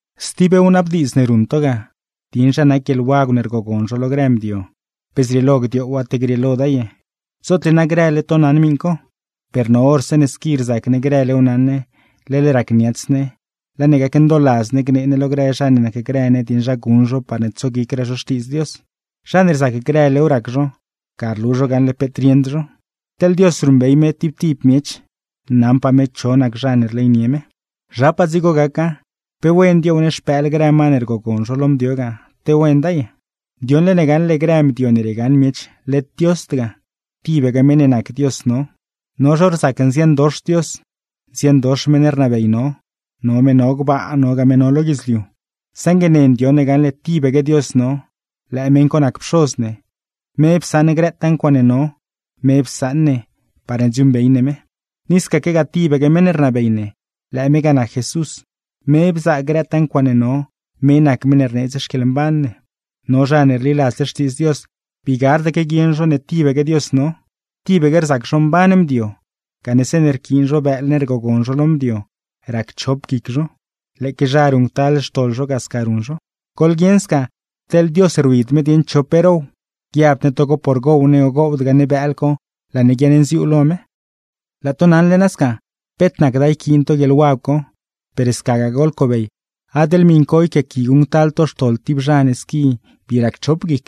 Stib wnabdiidz ne ruṉ to ga, dieṉ zha nac guieḻwagw ne rgogon zho lo grë mdio, pe zrieelo gdioowa, te grieeloda ye. Zootle na grële to naṉ miṉ co; per no hor zeeṉe squi rzac ne grëlew naṉ ne, leḻ racniats ne, laa ne gacndooladz ne gnee ne lo grë zha ne nacgrë ne dieṉ zha guṉ zho parne tsoguicraa zho Xtiidz Dios. Zha ne rzac grëlew rac zho, ga rlu zho gaṉle peet rieṉd zho. Teḻ Dios ruṉbey me tib tib miech, naṉpaa me cho nac zha ne rleynie me. Zhapaa dzigo gaca, ¿pe wena dioow ne xpëël grë ma ne rgogon zho lo mdio ga, te wenda ye? Ndioṉle ne gaṉle grë mdio ne riegaṉ miech led Diosd ga, tibaque meṉ ne nac Dios no. No zho rzac nziandox Dios, nziandox meṉ rnabey no, no me no gbaa, nogaa me no lo guidzliu, saṉgue ne ndioṉ ne gaṉle tibaque Dios no, lëë meṉ co nac Pxoz ne, me psaṉ grëtaa ncuaaṉe no, me psaṉ ne parne dziuuṉbey ne me. Ni scaquegaa, tibaque meṉ ne rnabey ne, lëë me ga nac Jesús, me bzaa grëtaa ncuaaṉe no, me nac meṉ ne rneedz xquieḻmban ne. Per no zha ne rliladzle Xtiidz Dios, bii gardaque guieṉ zho ne tibaque Dios no. Tibaque rzac zho mban mdio, gane zeeṉe rquiin zho bëël ne rgogon zho lo mdio racchop guic zho, lëëque zha ruṉctal xtoḻ zho ga sca ruṉ zho. Goḻguieṉ sca, teḻ Dios rwid me dieṉ cho pe row. Guiabd ne togo por gow ne o gowdgaa ne bëël co laa ne guiaṉnziuu lo me. Laa to naṉle nasca, peet nacda yquiin to guieḻwagw co, per scagaa goḻcobey adeḻ miṉ co yquiaaqui guṉctal to xtoḻ tib zha ne squi bii racchop guic.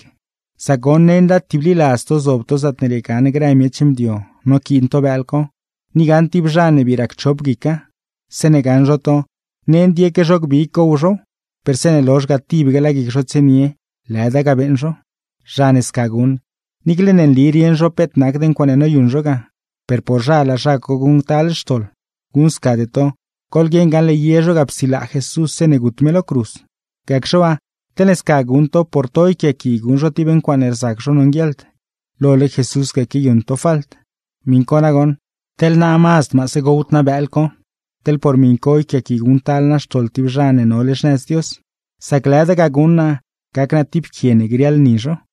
Sac goṉ, nenda tibliladz to zob to zaatne riegaṉ grë miech mdio noquiin to bëël co, ni gaṉ tib zha ne bii racchop guica. Zeeṉe gaṉ zho to, nend yeque zho gbig gow zhow, per zeeṉe lozh ga tibaque laa guic zho tsienie lëda ga beeṉ zho. Zha ne sca guṉ, niicle ne nli rieṉ zho peet nacd ncuaaṉe noyuṉ zho ga, per por zha laa zha co guṉctal xtoḻ. Guṉscade to, goḻguieṉ gaṉle ye zho ga psilaa Jesús zeeṉe gut me lo cruz; gacxe waa, teḻne sca guṉ to por to yquiaaqui guṉ zho tib ncuaaṉe rzac zho nonguieḻd, lole Jesús ga quiayuṉ to falt. Miṉ co nagoṉ, teḻ naa mazd maase gowd naa bëël co, teḻne por miṉ co yquiaaqui guṉctal naa xtoḻ tib zha ne nole xnëz Dios; sac lëda ga guṉ naa gac naa zig tib quie ne grieḻ ni zho.